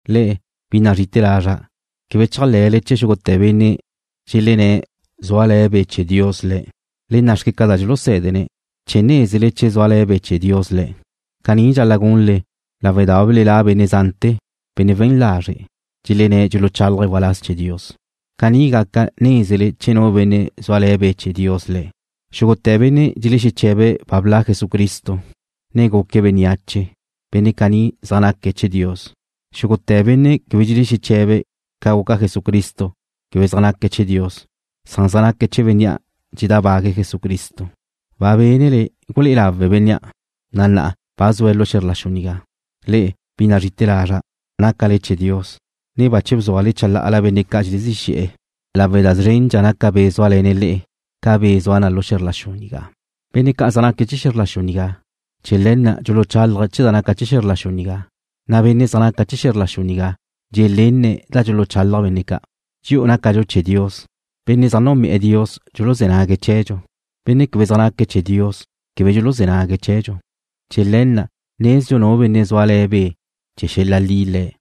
Le'e, bi nazrí'ite̱ lazra', quebe chéajle̱le chee̱ xúgute̱ benne' dxelenné̱' zúale̱ Be' chee̱ Dios le̱'. Le nna' xque ca naca da dxulusé̱dene̱' chee̱ nézele che zúale̱' Be' chee̱ Dios le̱'. Caní dxal-la' gunle lawe' da ba belelá' benne' zante̱, benne' we̱n lazre', dxelenné̱' dxuluchálaje̱' waláz chee̱ Dios. Caní gaca nézele che zúale̱ Be' chee̱ Dios tu benne'. Xúgute̱ benne' dxelexeche̱be̱' ba bla' Jesucristo, ne guque̱' bénneache, benne' caní zaj naque̱' chee̱ Dios. Xúgute̱ benne' quebe dxelexeche̱be̱' ca guca Jesucristo quebe zaj naque̱' chee̱ Dios. Zaj naque̱' chee̱ bénnea' dxedábague̱' Jesucristo. Ba bénele gulé'e lawe̱' bénnea', na' na'a ba zue̱' lu xe̱zr la xu nigá. Le'e, bi nazri'ite̱ lazra', nácale chee̱ Dios, ne bache bzúale chalá'ala benne' ca' dxelezí xe̱'e̱ lawe' da szrendxa naca Be' zúale̱ na le'e ca be' zua na lu xe̱zr la xu nigá. Benne' ca' zaj naque̱' chee̱ xe̱zr la xu nigá. Chee̱ le̱ na' dxuluchálaje̱' chee̱ da naca na chee̱ xe̱zr la xu nigá, na' benne' zaj zre̱'e̱ xe̱zr la xu nigá dxelenne̱' da dxuluchalaj benne' ca'. Dxi'u nácadxu chee̱ Dios. Benne' zaj núnbe'e̱ Dios dxuluzé̱ nague̱' chee̱dxu. Benne' quebe zaj naque̱' chee̱ Dios quebe dxuluzé̱ nague̱' chee̱dxu. Chee̱ le̱ na' nezdxu nu benne' zúale̱ Be' chee̱ xel-la' li le̱',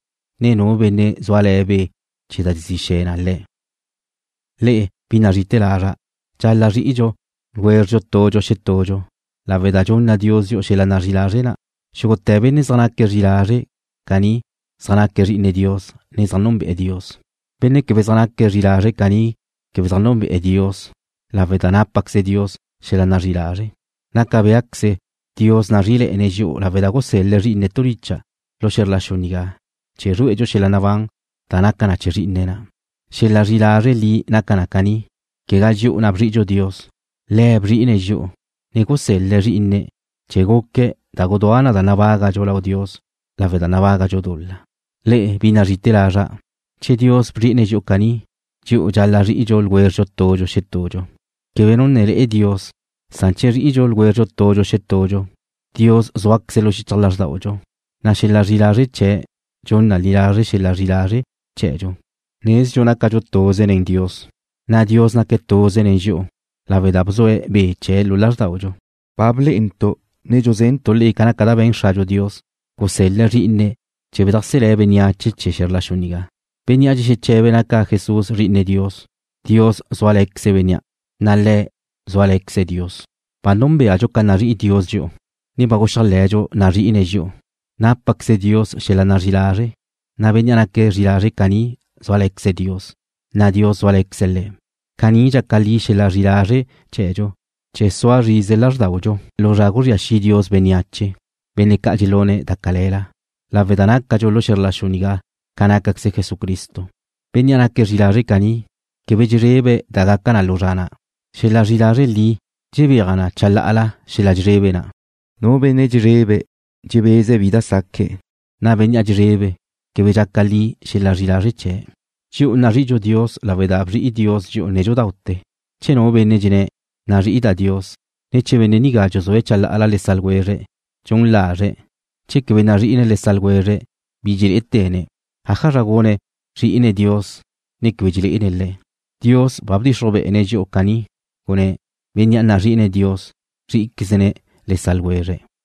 ne nu benne' zúale̱ be' chee̱ da dxezí xe̱ na le̱'. Le'e, bi nazrí'ite̱ lazra', dxal-la' zri'idxu tudxu xetudxu lawe' da dxunna Dios dxi'u xel-la' nazrí'i lazre' na'. Xúgute̱ benne' zaj naque̱' zri'i lazre' caní zaj naque̱' zri'ine Dios ne zaj núnbe'e̱ Dios. Bénnea' quebe naque̱' zri'i lazre' caní quebe núnbe'e̱ Dios lawe' da tu dxúnzqueze Dios da naca chee̱ xel-la nazrí'i lázre'. Naca béaqueze Dios nazrí'ile̱'e̱ne̱' dxi'u lawe' da gusel-le̱' Zrí'ine̱' tu licha' lu xe̱zr la xu nigá chee̱ zrué'edxu xel-la' nabán da naca na chee̱ Zrí'ine̱' na'. Xel-la' zri'i lazre' li naca na caní: Quegá dxi'u na' bzri'idxu Dios. Le̱' bzri'ine̱' dxi'u, ne gusel-le̱' Zrí'ine̱' chee̱ guque̱' da gudúa na da nabágadxu lau Dios lawe' da nabágadxu dul-la. Le'e, bi nazrí'ite̱ lazra', che Dios bzri'ine̱' dxi'u caní, dxi'u dxal-la' zri'idxu tudxu xetudxu. Quebe nu ne le'e Dios, san che zri'idxu tudxu xetudxu, Dios zúaqueze̱' lu xichaj lázrdaudxu, na' xel-la' zri'i lazre' chee̱' dxun na li lazre' xel-la' zri'i lazre' chee̱dxu. Nezdxu nácadxu tuze nen Dios, na' Dios naque̱' tuze nen dxi'u lawe' da bzue̱' Be' chee̱' lu lázrdaudxu. Ba blé'entu', ne dxuzentu' le'e ca naca da be̱n Xradxu Dios, gusel-le̱' Zrí'ine̱' chee̱ bedajselé̱' bénneache chee̱ xe̱zr la xu nigá. Bénnea' dxexeche̱be̱' naca Jesús Zri'ine Dios, Dios zúale̱queze̱' bénnea', na' le̱' zúale̱queze̱' Dios. Ba núnbeadxu ca nazrí'i Dios dxi'u, ne ba guxéajle̱dxu nazri'ine̱' dxi'u. Tu dxúnzqueze Dios da naca chee̱ xel-la nazrí'i lazre', na' bénnea' naque̱' zri'i lazre' caní zúale̱queze̱' Dios, na' Dios zúale̱queze̱' le̱'. Caní dxaca li xel-la' zri'i lazre' chee̱dxu, chee̱ sua zrize lázrdaudxu lu zra guzría xi' Dios bénneache, benne' ca' dxelune̱' da cale̱la, lawe' da nácadxu lu xe̱zr la xu nigá ca nácaqueze Jesucristo. Bénnea' naque̱' zri'i lazre' caní quebe dxezrebe̱' da gaca na lu zra na'. Xel-la' zri'i lazre' li dxebéaj na chalá'ala xel-la' dxezrebe na'. Nu benne' dxezrebe' dxebeze̱' bi da saque̱', na' bénnea' dxezrebe̱' quebe dxaca li xel-la' zri'i lazre' chee̱'. Dxi'u nazri'idxu Dios lawe' da bzri'i Dios dxi'u nédxudaute̱. Che nu benne' dxenné̱': Nazri'ida' Dios, ne che benne' nigá dxuzúe̱' chalá'ala le sa' ljwezre̱', dxun lazre̱'. Che quebe nazri'ine̱' le sa' ljwezre̱', bi dxelé'ete̱ne̱', ¿ájazra gune̱', zrí'ine̱' Dios, ne quebe dxelé'ene̱' Le̱'? Dios ba bdxixruj be'ene̱' dxi'u caní, gunné̱': Bénnea' nazri'ine̱' Dios, zrí'iquezne̱' le sa' ljwezre̱'.